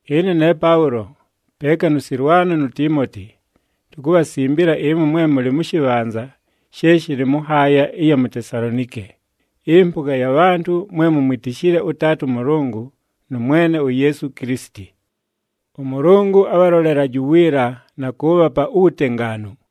Ɨne ne Paʉlo, peeka nʉ Sɨlwano nu Tiimoti, tukubhasimbila ɨmwe mwe mʉlɨ mʉ shɨbhanza she shɨlɨ mʉ nhaaya ɨya mu Tesalonike, ɨmpʉga ya bhantʉ mwe mumwitishile ʉTaata ʉMʉlʉngʉ nʉ Mwene uYeesu Kilisiti. ɄMʉlʉngʉ abhalolelaje uwiila na kʉʉbhapa uwutengaanu.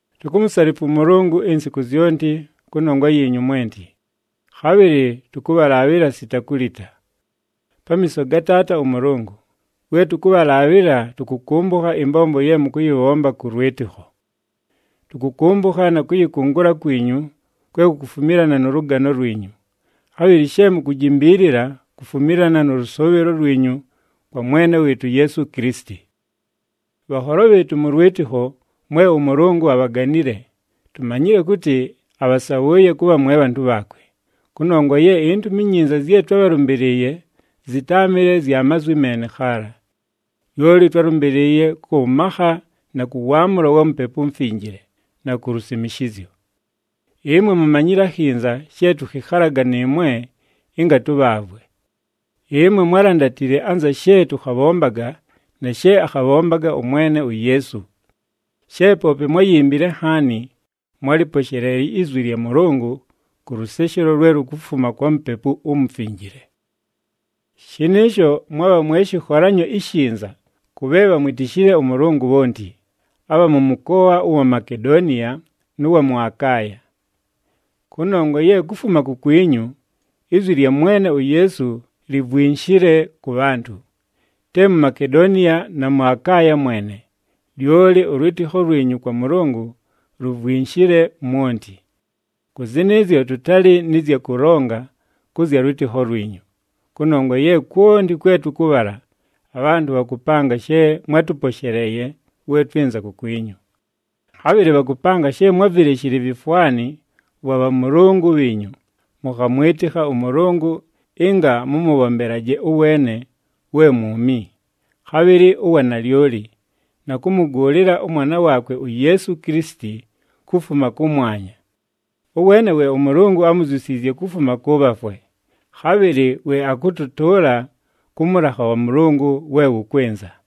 Tukumusalifwa ʉMʉlʉngʉ insiku zyonti kʉnongwa yiinyu mwenti, khabhɨlɨ tʉkʉbhalaabhɨla sita kulita. Pamiiso ga Taata ʉMʉlʉngʉ, we tʉkʉbhalaabhɨla tʉkʉkʉmbʉkha ɨmbombo ye mʉkʉyɨbhomba kʉ lwɨtɨkho. Tʉkʉkʉmbʉkha na kʉyɨkʉngʉla kwinyu kwe kukufumilana nʉ lʉgano lwinyu, khabhɨlɨ she mukujimbiilila kufumilana nʉ lʉsʉʉbhɨlo lwinyu kwa Mwene wɨɨtʉ uYeesu Kilisiti. Bhanholo bhɨɨtʉ mʉ lwɨtɨkho mwe ʉMʉlʉngʉ abhaganile, tumanyile kʉtɨ abhasabhʉʉye kʉbha mwe bhantʉ bhaakwe, kʉnongwa ye iNtumi iNyinza zye twábhalʉmbɨlɨɨye zɨtáamɨle zya mazwi meene khaala. Lyoli twálʉmbɨlɨɨye kʉ makha na kʉ waamʉlo wa Mupepu uMufinjile, na ku lusimishizyo. Ɨmwe mumanyile akhinza she tʉkhɨkhalaga nɨɨmwe ɨnga tʉbhaavwe. Ɨmwe mwálandatile anza she tʉkhabhombaga na she akhabhombaga ʉMwene uYeesu. She poope mwáyimbile nhaani, mwálɨposheleeye izwi lya Mʉlʉngʉ kʉ lʉseshelo lwe lukufuma kwa Mupepu uMufinjile. Shɨnɨɨsho mwabha mwe shɨkholanyo ishinza kʉ bhe bhamwitishile ʉMʉlʉngʉ bhonti, abha mʉ mʉkoa ʉwa Makedoniya nʉ wa mʉ Akaaya. Kʉnongwa ye kufuma kukwinyu, izwi lya Mwene uYeesu livwinshile kʉ bhantʉ. Te mu Makedoniya na mʉ Akaaya mwene, lyoli ʉlwɨtɨkho lwinyu kwa Mʉlʉngʉ luvwinshile mwonti. Kʉ zɨnɨɨzyo tʉtalɨ nɨ zya kʉlonga kʉ zya lwɨtɨkho lwinyu, kʉnongwa ye kwonti kwe tʉkʉbhala abhantʉ bhakʉpanga she mwátʉposheleeye we twɨnza kukwinyu. Khabhɨlɨ bhakʉpanga she mwávileshile ivifwani vwa bhamʉlʉngʉ bhiinyu, mʉkhamwɨtɨkha ʉMʉlʉngʉ ɨnga mʉmʉbhombelaje ʉweene we mwumi, khabhɨlɨ ʉwa nalyoli, na kʉmʉgʉʉlɨla ʉMwana waakwe uYeesu Kilisiti kufuma kʉmwanya. Ʉweene we ʉMʉlʉngʉ ámuzyusiizye kufuma kʉ bhafwe, khabhɨlɨ we akʉtʉtʉʉla kʉ mʉlakha wa Mʉlʉngʉ we wʉkwɨnza.